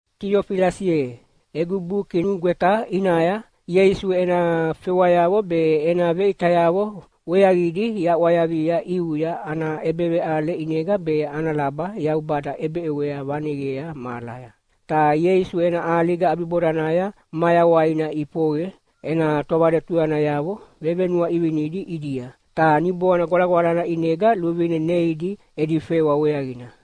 Tiofilasi ye, egu buki nugweta ʼinaya Ieisu ena fewayavo be ena veʼitayavo weaqidi yaʼwayavia ʼiuya ana ʼebeveʼale ʼinega be ana laba Yaubada ʼebeʼewea vaneqea mahalaya. Ta Ieisu ena ʼaliga ʼabibodanaya mayawaina ʼifoqe ena tovaletuyanayavo vevenuaʼivinidi ʼidia, ta Niboana Gwalagwalana ʼinega luvine neidi edi fewa weaqina.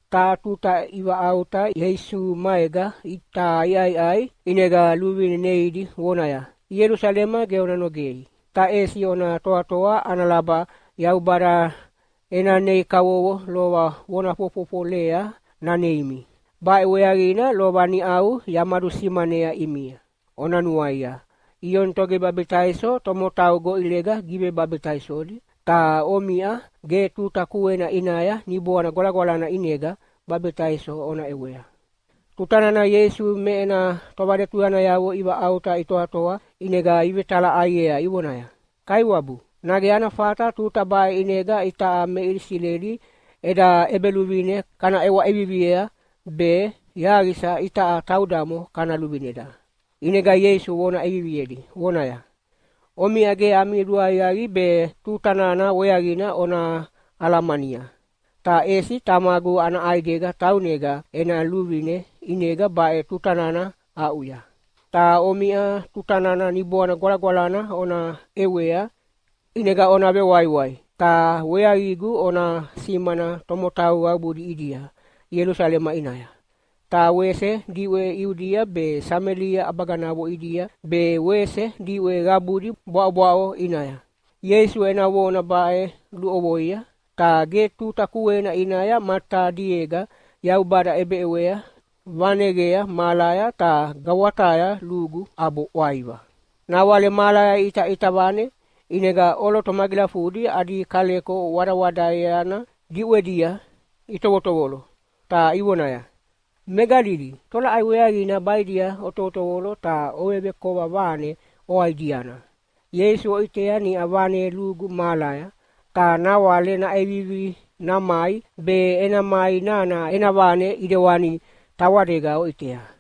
Taha tuta ivaʼauta Ieisu maega ta iʼaiʼai, ʼinega luvine neidi vonaya, “Ielusalema ge ona nogei, ta ʼesi ona toatoa ana laba Yaubada ena nei kavovo lova vona fofofolea naneimi. Baʼe weaqina lova niʼau yamadusimanea ʼimia. Ona nuaia, Ioni Togivebabitaiso tomotau goʼilega givebabitaisodi, ta omiʼa ge tuta kuena ʼinaya Niboana Gwalagwalana ʼinega babitaiso ona ʼewea.” Tuta nana Ieisu me ena tovaletuyanayavo ivaʼauta itoatoa ʼinega ivetalaʼaiea ivonaya, “Kaiwabu, nage ana fata tuta baʼe ʼinega itaʼa me Isileli eda ʼebeluvine kana ʼewa ʼeviviea, be yaqisa itaʼa taudamo kana luvineda?” ʼInega Ieisu vona ʼeviviedi vonaya, “Omiʼa ge ami luaqiaqi be tuta nana weaqina ona alamania, ta ʼesi Tamagu ana ʼaidega taunega ena luvine ʼinega baʼe tuta nana aʼuya. Ta omiʼa tutana Niboana Gwalagwalana ona ʼewea, ʼinega ona vewaiwai, ta weaqigu ona simana tomotau qabudi ʼidia Ielusalema ʼinaya, ta wese diʼwe Iudia be Samelia ʼabaganavo ʼidia be wese diʼwe qabudi bwaʼobwaʼo ʼinaya.” Ieisu ena vona baʼe luʼovoia, ta ge tuta kuena ʼinaya matadiega Yaubada ʼebeʼewea vaneqea mahalaya ta gawataya lugu ʼabo ʼwaiva. Nawale mahalaya iʼitaʼita vane, ʼinega ʼoloto magilafudi adi kaleko wadawadaeana diʼwedia itovotovolo, ta ivonaya, “Me Galili, tolaʼai weaqina baʼidia otovotovolo ta ovevekova vane oaʼidiana? Ieisu oʼitea niʼa vane lugu mahalaya, ta nawale naʼevivi namai, be ena mai nana ena vane ʼidewani tawadega oʼitea.”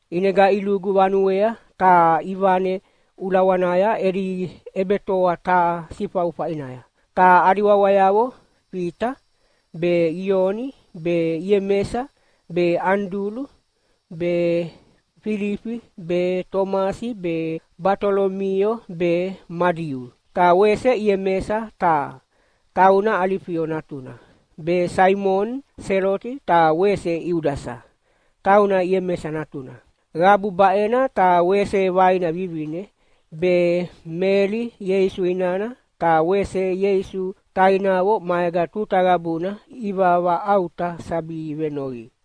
ʼInega ilugu vanuea ta ivane ulawanaya edi ʼebetoa taha sifaufa ʼinaya. Ta adi wawayavo Fita be, Ioni be, Iemesa be, Anidulu be, Filifi be, Tomasi be, Batolomio be Madiu, ta wese Iemesa taha, tauna Alifio natuna, be Saimoni Seloti ta wese Iudasa, tauna Iemesa natuna. Qabu baʼena ta wese vaina vivine, be Meli Ieisu inana ta wese Ieisu tainavo maega tuta qabuna ivavaʼauta sabi venoqi.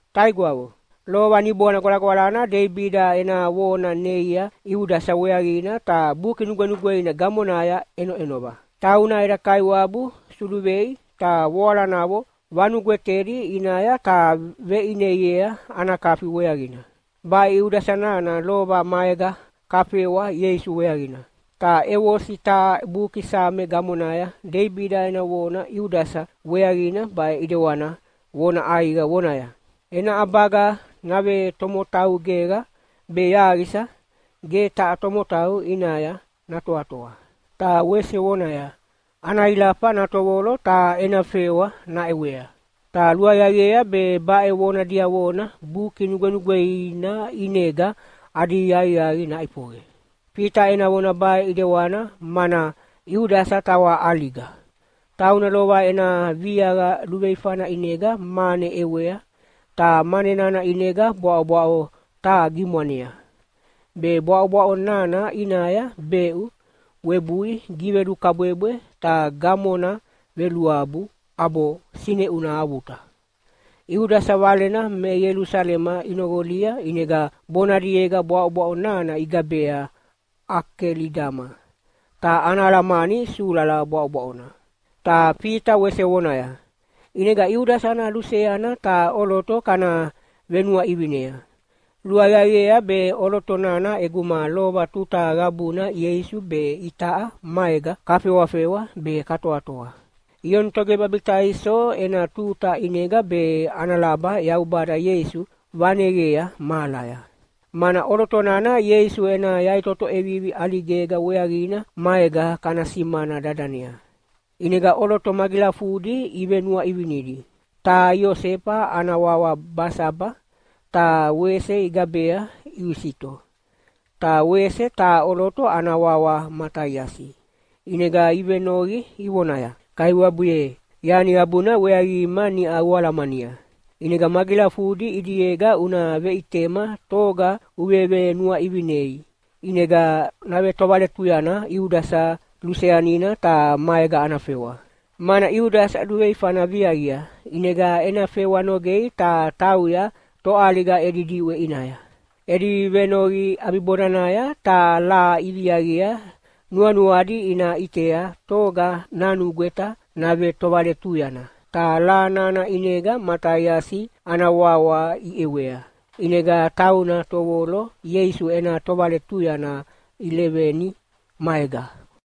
“Taigwavo, lova Niboana Gwalagwalana Deibida ena vona neia Iudasa weaqina ta Buki Nugwenugweina gamonaya ʼenoʼenova. Tauna eda Kaiwabu suluvei ta voalanavo vanugwetedi ʼinaya ta veʼineiea ana kafi weaqina. Baʼe Iudasa nana lova maega kafewa Ieisu weaqina. Ta ʼevosi taha buki Same gamonaya Deibida ena vona Iudasa weaqina baʼe ʼidewana vona ʼaiqa vonaya, ‘Ena ʼabaga navetomotau geqa, be yaqisa ge taha tomotau ʼinaya natoatoa.’ Ta wese vonaya, ‘Ana ilafa natovolo ta ena fewa naʼewea.’ ‘Ta luaqiaqiea be baʼe vona diavona Buki Nugwenugweina ʼinega adi aqiaqi naʼifoqe.’” Fita ena vona baʼe ʼidewana mana Iudasa tawa ʼaliga. Tauna lova ena viaqa luveifana ʼinega mane ʼewea, ta mane nana ʼinega bwaʼobwaʼo taha gimwanea. Be bwaʼobwaʼo nana ʼinaya beʼu webui givelukabwebwe ta gamona veluabu ʼabo sineʼuna avuta. Iudasa valena me Ielusalema inoqolia ʼinega bonadiega bwaʼobwaʼo nana igabea “Akelidama”, ta ana alamani “Sulala Bwaʼobwaʼona”. Ta Fita wese vonaya, “ʼInega Iudasa ana luseana taha ʼoloto kana venuaʼivinea. Luaqiaqiea be ʼoloto nana ʼeguma lova tuta qabuna Ieisu be itaʼa maega kafewafewa be katoatoa, Ioni Togivebabitaiso ena tuta ʼinega be ana laba Yaubada Ieisu vaneqea mahalaya. Mana ʼoloto nana Ieisu ena yaʼitoto ʼevivi ʼaligega weaqina maega kana simana dadanea.” ʼInega ʼoloto magilafudi ivenuaʼivinidi. Taha Iosefa ana wawa Basaba, ta wese igabea Iusito. Ta wese taha ʼoloto ana wawa Mataiasi. ʼInega ivenoqi ivonaya, “Kaiwabu ye, yani qabuna weaqima niʼa ualamania. ʼInega magilafudi ʼidiega una veʼitema toga uvevenuaʼivinei, ʼinega navetovaletuyana Iudasa luseanina ta maega ana fewa. Mana Iudasa luveifana viaqia ʼinega ena fewa nogei ta tauya toʼaliga edi diʼwe ʼinaya.” Edi venoqi ʼabibodanaya taha laha iviaqia nuanuadi ina ʼitea toga nanugweta navetovaletuyana. Ta laha nana ʼinega Mataiasi ana wawa iʼewea, ʼinega tauna tovolo Ieisu ena tovaletuyanayavo leveni maega.